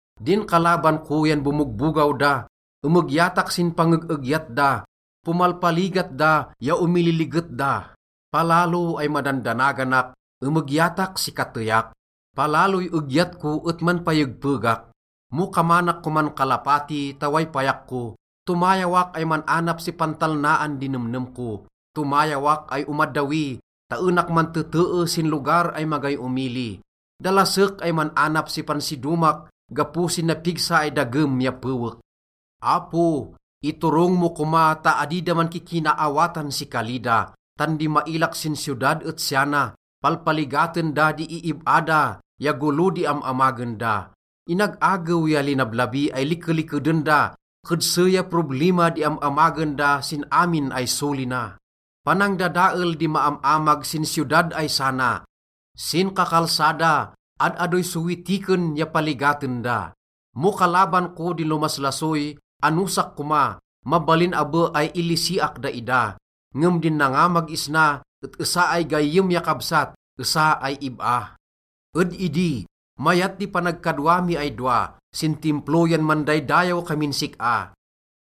Din kalaban ko yan bomogbogaw da, emegyatak sin pangeg-egyat da. Pomalpaligat da ya omililiget da. Palalo ay madandanaganak, emegyatak si kateyak. Palaloy egyat ko et manpayegpegak. Mo kamanak koman kalapati ta way payak ko, tomayawak ay man-anap si pantalnaan di nemnem ko. Tomayawak ay omaddawi ta enak mantetee sin lugar ay magay omili. Dalasek ay man-anap si pansidomak gapo sin napigsa ay dagem ya pewek. Apo, iturong mo koma ta adi da mankikinaawatan si kali da. Tan di mailak sin siyodad et siya na: palpaligaten da di iib-a da ya golo di am-amagen da. Inag-agew ya linablabi ay likelikeden da, kedse ya problima di am-amagen da sin amin ay soli na. Panangdadael di maam-amag sin siyodad ay sana, sin kakalsada, ad-adoy sowitiken ya paligaten da. Mo kalaban ko di lomaslasoy, anosak koma. Mabalin abe ay ilisiak daida. Ngem din nangamag isna et esa ay gayyem ya kabsat, esa ay ib-a. Ed idi, mayat di panagkadwa mi ay dowa, sin Timplo yan mandaydayaw kamin sik-a.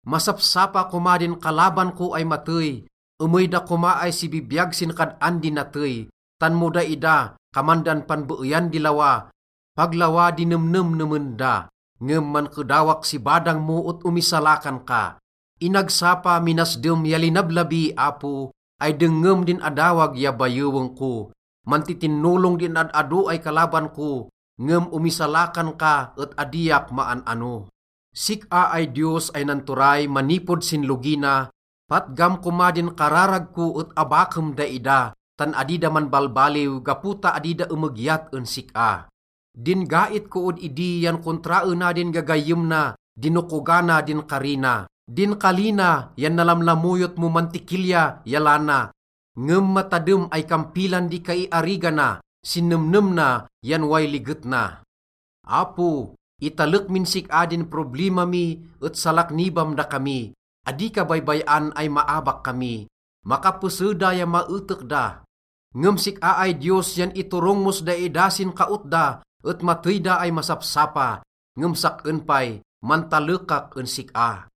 Masapsapa koma din kalaban ko ay matey. Emey da koma ay sibibiyag sin kad-an di natey, tan mo daida, kaman dan panbeeyan di lawa, pag lawa di nemnemnemen da. Ngem mankedawak si badang mo et omisalakan ka. Inagsapa, minasdem ya linablabi, Apo, ay dengngem din adawag ya bayeweng ko. Mantitinolong din ad-ado ay kalaban ko, ngem omisalakan ka et adiak maan-ano. Sik-a ay Diyos ay nanturay manipod sin logi na, patgam koma din kararag ko et abakem daida, tan adi da manbalbaliw gapo ta adi da emegyat en sik-a. Din gait ko ed idi yan kontraena din gagayyem na, dinokogana din kari na. Din kali na yan nalamlamoyot mo mantikilya ya lana, ngem matadem ay kampilan di kaiarigana, sin nemnem na yan way liget na. Apo, italek min sik-a din problima mi et salaknibam dakami, adi ka baybay-an ay maabak kami. Makapese da ya maetek da, ngem sik-a ay Diyos yan iturong mos daida sin kaot da et matey da ay masapsapa. Ngem sak-en pay, mantalekak en sik-a.